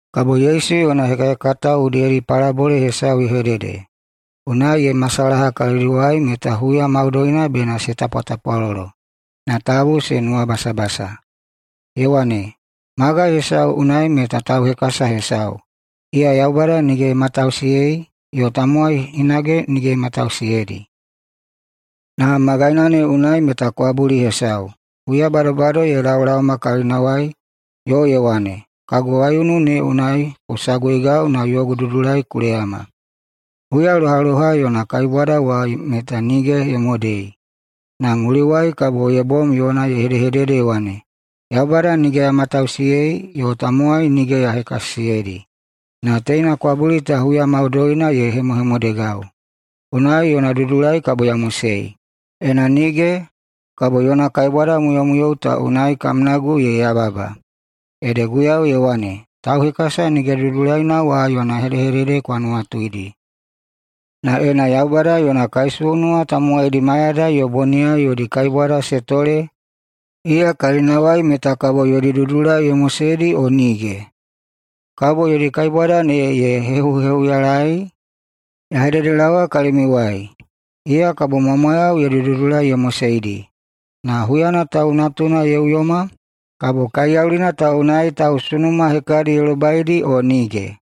Kabo Yesu yona hekahekatao udiyedi palabole hesau ye hedede, unai ye hemasalaha kalidiwai meta huya maudoina bena se tapwatapwalolo, na tabu se nuwabasabasa. Ye wane, “Magai hesau unai meta tauhekasa hesau, iya Yaubada nige ye matausiyei yo tamowai hinage nige ye hekasisiyeidi. Na magaina ne unai meta kwabuli hesau, huya badobado ye laolaoma kalinawai yo ye wane, ‘Kagu waiunu ne unai ku saguigau na yogu dudulai ku leyama.’ Huya lohaloha yona kaibwada wa meta nige ye modei, na mulinawai kabo ye bom yona ye hedehedede ye wane, ‘Yaubada nige ya matausiyei yo tamowai nige ya hekasisiyeidi, na teina kwabuli ta huya maudoina ye hemohemodegau, unai yona dudulai kabo ya mosei. Ena nige, kabo yona kaibwadamuyomuyou ta unai kamnagu ye heyababa!’” Ede Guiyau ye wane, “Tauhekasa nige dudulaina wa yona hedehedede kwa nuwatuidi. Na ena Yaubada yona kaisunuwa tamowaidi mayadai yo boniyai yodi kaibwada se tole iya kalinawai meta kabo yodi dudulai ye moseidi o nige? Kabo yodi kaibwada ne ye hehuhehuyalaei? Ya hededelaowa kalimiuwai: Iya kabo mwamwayau yodi dudulai ye moseidi. Na huyana Tau Natuna ye uyoma, kabo kaiyaulina ta unai tausunuma hekadi ye lobaidi o nige?”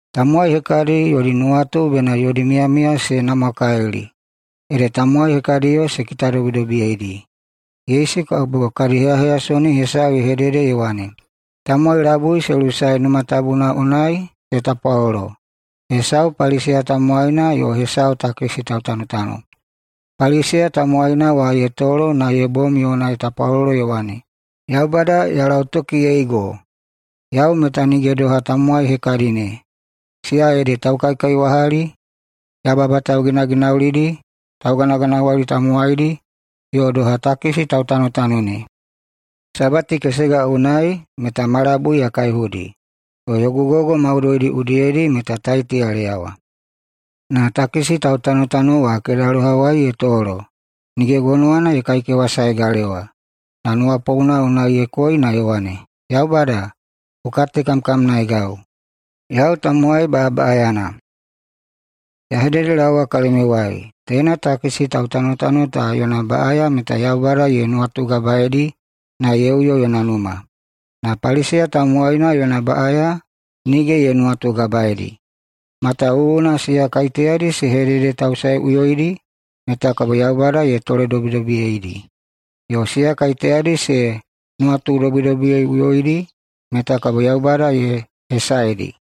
Tamowai hekadi yodi nuwatu bena yodi miyamiya se namwakalili, ede tamowai hekadiyo se kitadobidobiyeidi. Yesu kabo kadi heyaheyasoni hesau ye hedede ye wane, “Tamowai labui se lusae Numa Tabuna unai se tapwalolo, hesau Paliseya tamowaina yo hesau takisi tautanotano. Paliseya tamowaina wa ye tolo na ye bom yona ye tapwalolo ye wane, ‘Yaubada, ya lautokiyeigo! Yau meta nige doha tamowai hekadi ne, siya ede taukaikaiwahali, yababa tauginaginaulidi, tauganaganawali tamowaidi – yo doha takisi tautanotano ne. Sabati kesega unai meta ma labui ya kaihudi, yo yogu gogo maudoidi udiyedi meta taiti ya leyawa.’ Na takisi tautanotano wa kedalohawai ye tolo. Nige gonowana ye kaikewasae galewa, na nuwapouna unai ye koi na ye wane, ‘Yaubada, ku katekamkamnaeigau, yau tamowai baꞌabaꞌayana.’ Ya hededelaowa kalimiuwai: Teina takisi tautanotano ta yona baꞌaya meta Yaubada ye nuwatugabaeidi na ye uyo yona numa. Na Paliseya tamowaina yona baꞌaya nige ye nuwatugabaeidi. Matawuwuna siya kaiteyadi se hededetausaeꞌuyoidi meta kabo Yaubada ye toledobidobiyeidi, yo siya kaiteyadi se nuwatudobidobiyeiꞌuyoidi meta kabo Yaubada ye hesaedi.”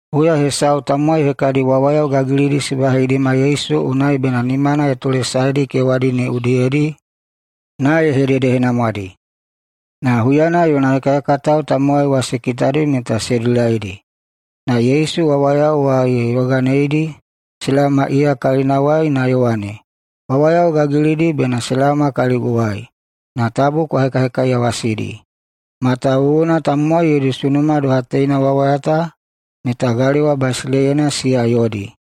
Huya hesau tamowai hekadi wawayao gagilidi se baheidima Yesu unai bena nimana ye tolesaedi kewadi ne udiyedi na ye hededehenamwadi. Na huyana yona hekahekatao tamowai wa se kitadi meta se dilaidi. Na Yesu wawayao wa ye yoganeidi se laoma iya kalinawai na ye wane, “Wawayao gagilidi bena se laoma kaliguwai, na tabu kwa hekahekaiyawasidi, matawuwuna tamowai yodi sunuma doha teina wawayao ta meta galewa basileiyana siya yodi.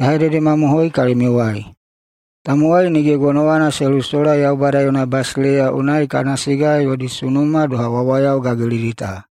Ya hededemamohoi kalimiuwai: Tamowai nige gonowana se lusola Yaubada yona basileiya unai kana siga yodi sunuma doha wawaya gagilidi ta.”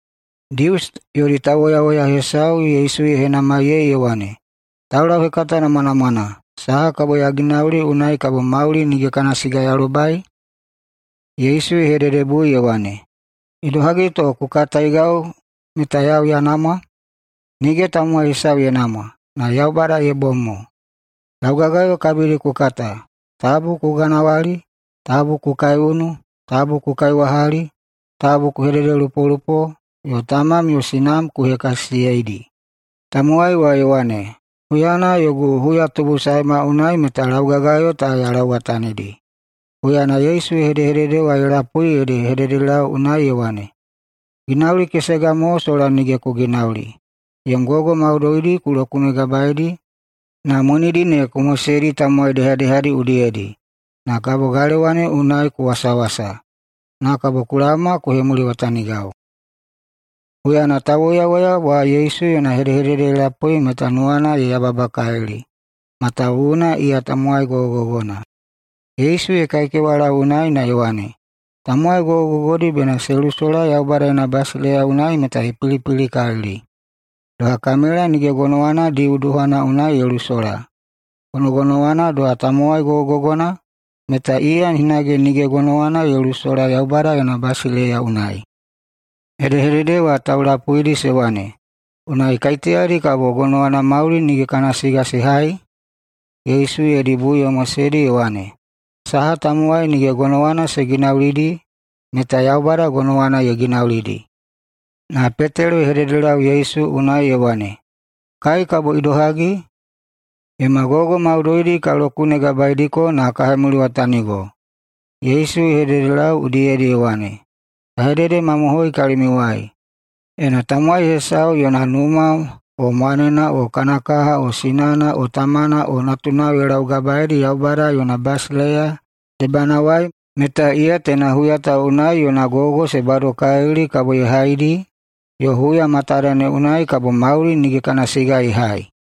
Dius yodi tauwoyawoya hesau Yesu ye henamaiyei ye wane, “Taulauhekata namwanamwana, saha kabo ya ginauli unai kabo mauli nige kana siga ya lobai?” Yesu ye hededebui ye wane, “Idohagi to ku kataigau meta yau ya namwa? Nige tamowai hesau ye namwa, na Yaubada ye bom mo. Laugagayo kabidi ku kata: ‘Tabu ku ganawali, tabu ku kaiunu, tabu ku kaiwahali, tabu ku hededelupolupo, yo tamam yo sinam ku hekasisiyeidi.’” Tamowai wa ye wane, “Huyana yogu huyatubusaema unai meta laugagayo ta ya lauwatanidi.” Huyana Yesu hedehedede wa ye lapui ede ye hededelau unai ye wane, “Ginauli kesega mo sola nige ku ginauli. Yom gogo maudoidi ku lokunegabaeidi na monidi ne ku moseidi tamowai dehadehadiyao udiyedi, na kabo galewa ne unai ku wasawasa. Na kabo ku laoma ku hemuliwatanigau.” Huyana tauwoyawoya wa Yesu yona hedehedede ye lapui meta nuwana ye yababakalili, matawuwuna iya tamowai gogogogona. Yesu ye kaikewalau unai na ye wane, “Tamowai gogogogodi bena se lusola Yaubada yona basileiya unai meta ye pilipilikalili. Doha kamela nige gonowana diu duhana unai ye lusola, gonogonowana doha tamowai gogogogona meta iya hinage nige gonowana ye lusola Yaubada yona basileiya unai.” Hedehedede ta taulapuidi se wane, “Unai kaiteyadi kabo gonowana mauli nige kana siga se hai?” Yesu yodi bui ye moseidi ye wane, “Saha tamowai nige gonowana se ginaulidi meta Yaubada gonowana ye ginaulidi.” Na Petelo ye hededelau Yesu unai ye wane, “Kai kabo idohagi? Yoma gogo maudoidi ka laugabaeidiko na ka hemuliwatanigo.” Yesu ye hededelau udiyedi ye wane, “Ya hededemamohoi kalimiuwai: Ena tamowai hesau yona numa o mwanena o kana kaha o sinana yo tamana o natunao ye laugabaedi Yaubada yona basileiya debanawai meta iya teina huya ta unai yona gogo se badokalili kabo ye haidi yo huya matada ne unai kabo mauli nige kana siga ye hai.”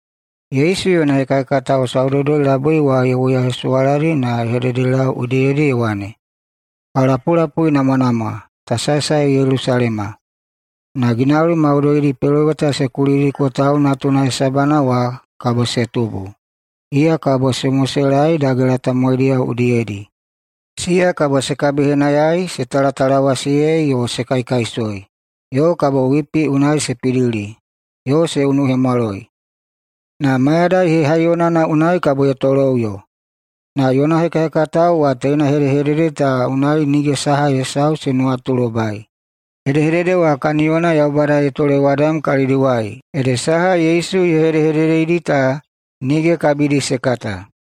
Yesu yona hekahekatao saudoudoi-labui wa ye woyahesuwaladi na ye hededelau udiyedi ye wane, “Kwa lapulapuinamwanamwa! Ta saesae Yelusalema, na ginauli maudoidi peloweta se kulidiko Tau Natuna hesabana wa kabo se tubu. Iya kabo se moselaei dagela tamowaidiyao udiyedi. Siya kabo se kabihenayaei, se talatalawasiyei, yo se kaikaisoi, yo kabo wipi unai se pidili, yo se unuhemwaloi. Na mayadai hehaiyonana unai kabo ye toloꞌuyo.” Na yona hekahekatao wa teina hedehedede ta unai nige saha hesau se nuwatulobai. Hedehedede wa kaniyona Yaubada ye tolewadam kalidiwai ede saha Yesu ye hedehededeidi ta nige kabidi se kata.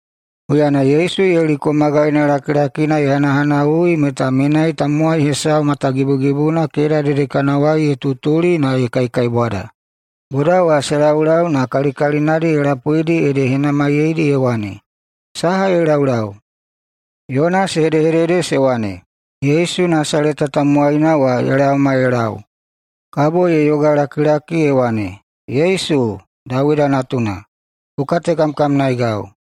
Huyana Yesu Yeliko magaina lakilakina ye hanahanawui meta menai tamowai hesau matagibugibuna keda dedekanawai ye tutuli na ye kaikaibwada. Boda wa se laulau na kalikalinadi ye lapuidi ede ye henamaiyeidi ye wane, “Saha ye laulau?” Yona se hedehedede se wane, “Yesu Nasaleta tamowaina wa ye laoma ye lau.” Kabo ye yogalakilaki ye wane, “Yesu, Dawida Natuna, ku katekamkamnaegau!”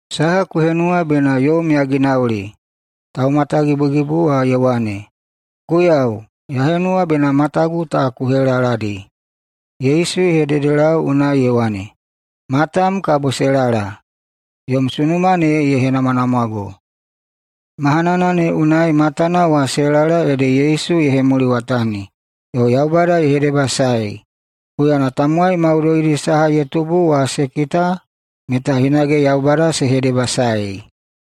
“Saha ku henuwa bena yom ya ginauli?” Taumatagibugibu wa ye wane, “Guiyau, ya henuwa bena matagu ta ku helaladi.” Yesu ye hededelau unai ye wane, “Matam kabo se lala. Yom sunuma ne ye henamwanamwago.” Mahanana ne unai matana wa se lala ede Yesu ye hemuliwatani, yo Yaubada ye hedebasaei. Huyana tamowai maudoidi saha ye tubu wa se kita meta hinage Yaubada se hedebasaei.